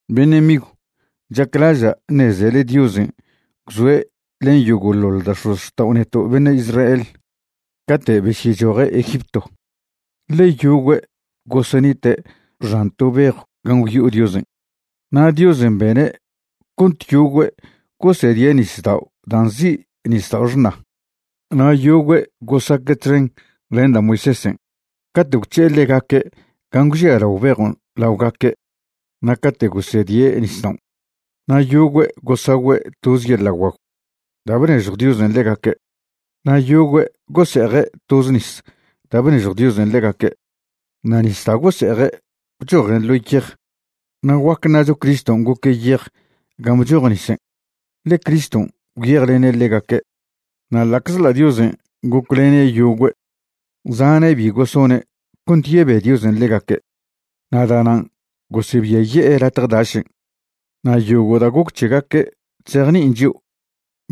Beṉe' migw, chaclaža' ṉezele Diosen' gwzoe' len yogo'ḻoḻ da' x̱ozxtao' neto' beṉe' Israel cate' besyechoje' Egipto, ḻe yogüe' gosenite' xan to bejw gan' gwyo'o Diosen', na' Diosen' bene' cont yogüe' gosedie' nisdao' da' nzi' Nisdao' Xṉa. Na' yogüe' gosaque' txen len da' Moisésen' cate' gwc̱he'e ḻegaque' gan' gwžialao bejon' laogaque' na' cate' gosedie' nisdaon'. Na' yogüe' gosagüe' toze yeḻa' guagw da' bnežjw Diosen' ḻegaque'. Na' yogüe' gose'eje' toze nis da' bnežjw Diosen' ḻegaque'. Na' nis da' gose'eje' bchojen ḻo yej, na' guac ṉacho Criston' goque' yej gan' bchoj nisen', ḻe Criston' gwyejlene' ḻegaque'. Na' ḻa'czḻa' Diosen' goclene' yogüe', zane' bi gosone' cont yebe Diosen' ḻegaque', na' da'nan' gosebiaye'e latje dašen'. Na' yogo' da' goc c̱hegaque' chzejni'in chio'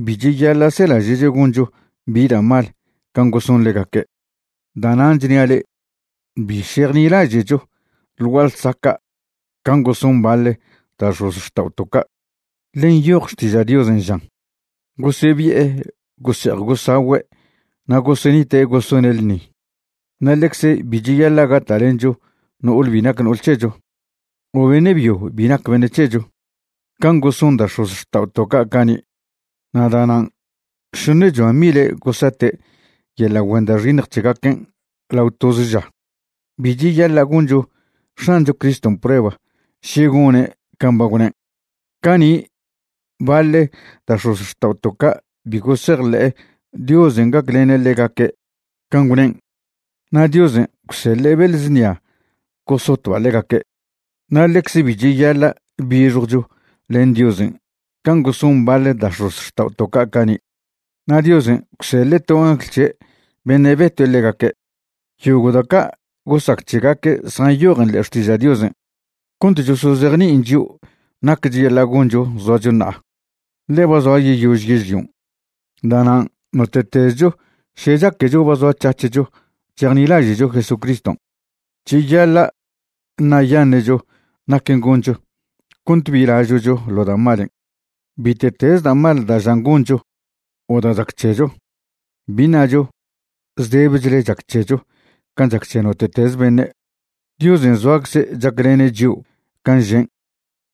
bi cheyaḻa' selaže'cho goncho bi da' mal can' goson ḻegaque'. Da'nan' chnia' le'e, bi šejnilaže'cho ḻ gua'a ḻsaca' can' goson baḻ da' x̱ozxta'oto' ca'. Ḻe nyoj Xtiža' Diosen' žan: “Gosebi'e gose'ej gosagüe' na' gosenite' gosone' ḻṉi.” Na' ḻecze bi cheyaḻa' gata'lencho no'ole bi nac no'ol c̱hecho o beṉe' byo bi nac beṉe' c̱hecho. Can' goson zan da' x̱ozxta'oto' cani', na' da'nan' šoṉechoa mile' gosate' yeḻa' güen da' xiṉj c̱hegaquen' lao toze ža. Bi cheyaḻa' goncho X̱ancho Criston' prueba še gone' can' ba gwnen'. Cani' baḻ da' x̱ozxta'oto' ca' bi gosejḻe'e Diosen' gaclene' ḻegaque' can' gwnen', na' Diosen' gwseḻe' beḻ znia gosotba' ḻegaque'. Na' ḻecze bi cheyaḻa' bixjwcho len Diosen' can' goson baḻ da' x̱ozxta'oto' ca' cani', na' Diosen' gwseḻe' to angl c̱he' beṉe' betue' ḻegaque'. Yogo' da' ca' gosac c̱hegaque' zjanyojen ḻe'e Xtiža' Diosen' cont chosozejni'in chio' nac cheyaḻa' goncho zoacho ṉa'a, ḻe ba zoa yeyož yežlion'. Da'nan' note'tezcho še chaquecho ba zoac̱hac̱hcho chejnilaže'cho Jesucriston', cheyaḻa' ṉa'yaṉe'cho naquen' goncho cont bi lažo'cho ḻo da' malen'. Bite'teze da' mal da' žan goncho o da' chac c̱hecho, bi ṉacho zdebechle chac c̱hecho can' chac c̱he note'teze beṉe'. Diosen' zoacze' chaclene' chio' can' žen',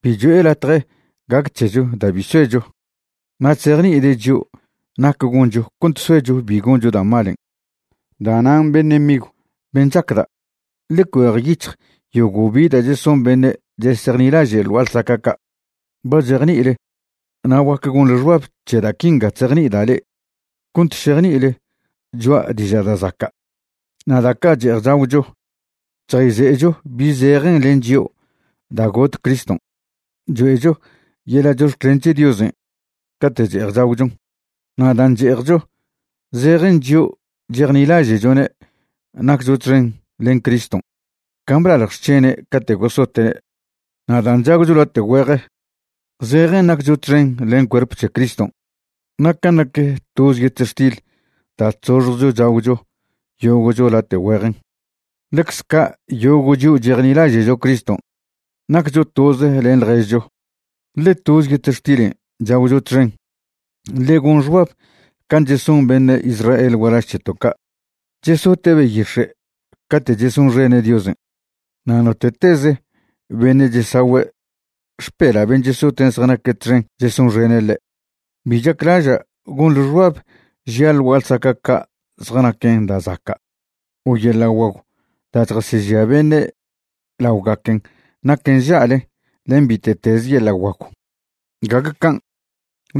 bi cho'e latje gac c̱hecho da' bi soecho. Na' chzejni'ide' chio' nac goncho cont soecho bi goncho da' malen'. Da'nan' beṉe' migw ben' chacda', ḻe cuejyic̱hj yogo' bi da' cheson beṉe' chesejnilaže' ḻ gua'a ḻsaca' ca'. Ba chejni'ile na' guac gonḻe xbab c̱he da' quinga chzejni'ida' le'e cont šejni'ile choa' diža' da' zaca'. Na' da' ca' che'ej chagwcho chjayze'echo bi zejen len chio' da' got Criston', choe'cho yeḻa' chox̱clen c̱he Diosen' cate' che'ej chagwchon. Na' dan' che'ejcho zejen chio' chejnilaže'chone' naccho txen len Criston' can' blalj xc̱hene' cate' gosote'ne'. Na' dan' chagwcho late' güeje, zejen naccho txen len cuerp c̱he Criston'. Na' can' nac toze yetextil da' chzoxjcho chagw yogo'cho late' güejen, ḻecze ca' yogo' chio' chejnilaže'cho Criston' naccho toze len ḻježcho, ḻe toze yetextilen' chagwcho txen. Ḻe gon xbab can' cheson beṉe' Israel gualaž c̱heto' ca', chesote' beyix̱e' cate' chesonxene' Diosen', na' note'tez beṉe' chesagüe' xpela' ben' chesoten' zjanaque' txen chesonxene' ḻe'. Bi chaclaža' gonḻe xbab žia' ḻ gua'a ḻsaca' ca' zjanaquen da' zaca' o yeḻa' guagw da' chjasežia beṉe' laogaquen naquen nža'le len bite'teze yeḻa' guagw. Gague can',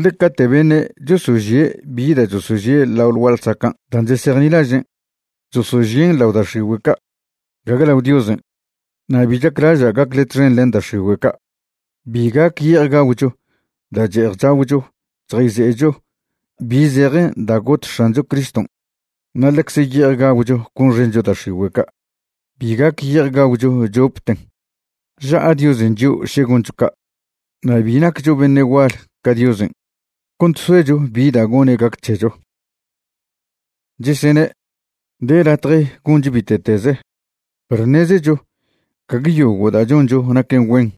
ḻe cate' beṉe' chosožie' bi da' chosožie' lao ḻ gua'a ḻsacan' dan' chesejnilažen', chosožien' lao da' x̱igüe' ca', gague lao Diosen', na' bi chaclaža' gacle txen len da' x̱igüe' ca'. Bi gac ye'ej gagwcho da' che'ej chagwcho chjayze'echo bi zejen da' got X̱ancho Criston' na' ḻecze ye'ej gagwcho gonxencho da' x̱igüe' ca'. Bi gac ye'ej gagwcho chopten. Ža'a Diosen' chio' še goncho ca'. Na' bi naccho beṉe' gual ca Diosen' cont soecho bi da' gone' gac c̱hecho. Chesene': “De latje goncho bite'teze”, perw ṉezecho gague yogo' da' choncho naquen güen,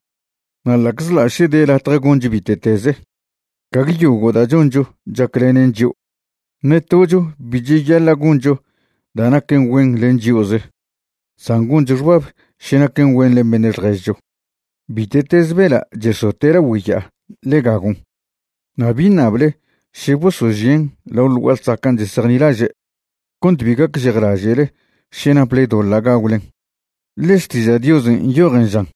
na' ḻa'czḻa' še de latje goncho bite'teze, gague yogo' da' choncho chaclenen chio'. Ṉe tocho bi cheyaḻa' goncho da' naquen güen len chio'ze, san goncho xbab še naquen güen len beṉe' ḻježcho. Bite'teze bela' chesote' lagüe' ya'a ḻe gagon' na' bi ṉable še bosožien' lao ḻ gua'a ḻsacan' chesejnilaže', cont bi gacžejlaže'le še naple doḻa' gagwlen. Ḻe Xtiža' Diosen' nyojen žan: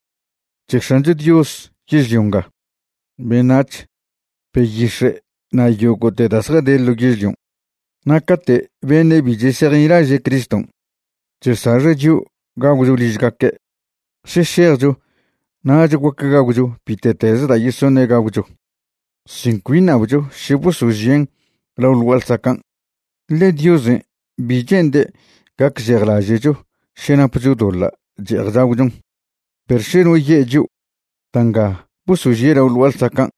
“C̱he X̱ancho Dios yežlio nga, beṉac̱h, beyix̱e' na' yogo'te da' zjade ḻo yežlion'.” Na' cate' beṉe' bi chesejnilaže' Criston' chesaxe' chio' gagwcho ližgaque', še šejcho nach guac gagwcho bite'teze da' yesoṉe' gagwcho sin cbi ṉabcho še bosožien' lao ḻ gua'a ḻsacan', ḻe Diosen' bi che'nde' gacžejlaže'cho še napcho doḻa' che'ej chagwchon. Perw še no ye' chio': “Da' nga bosožie' lao ḻ gua'a ḻsacan'”,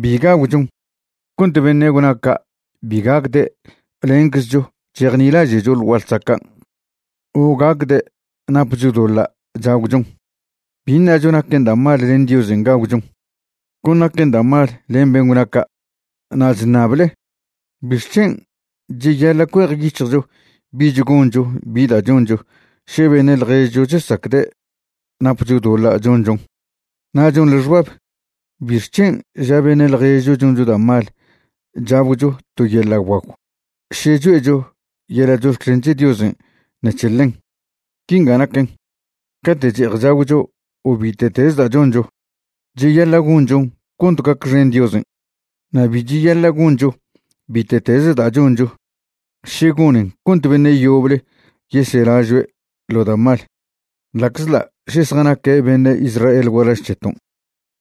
bi gagwchon cont beṉe' gwna ca' bi gacde' lenczcho chejnilaže'cho ḻ gua'a ḻsacan', o gacde' napcho doḻa' chagwchon. Bi ṉacho naquen da' mal len Diosen' gagwchon, con naquen da' mal len ben' gwna ca'. Na' chṉable ¿bixc̱hen' cheyaḻa' cuejyic̱hjcho bich goncho bi da' choncho še beṉe' ḻježcho chesacde' napcho doḻa' chonchon? Na' chonḻe xbab ¿bixc̱hen' ža beṉe' ḻježcho choncho da' mal chagwcho to yeḻa' guagw še choe'cho yeḻa' chox̱clen c̱he Diosen' ṉec̱he ḻen? Quinga naquen, cate' che'ej chagwcho o bite'teze da' choncho, cheyaḻa' gonchon cont gacxen Diosen'. Na' bi cheyaḻa' goncho bite'teze da' choncho še gonen cont beṉe' yoble yeselažoe' ḻo da' mal, ḻa'czḻa' še zjanaque' beṉe' Israel gualaž c̱heton',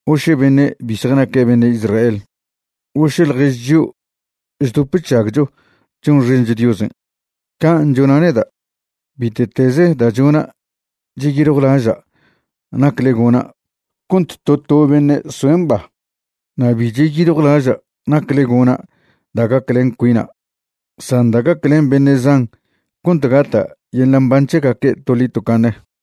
o še beṉe' bi zjanaque' beṉe' Israel, o še ḻjež chio' chdop chžagcho chonxencho Diosen'. Can' chona' neda', bite'teze da' chona' cheyiljwlaža' nacle gona' cont to to beṉe' soe' mba. Na' bi cheyiljwlaža' nacle gona' da' gaclen cuina' san da' gaclen beṉe' zan cont gata' yeḻa' mban c̱hegaque' toḻi tocaṉe.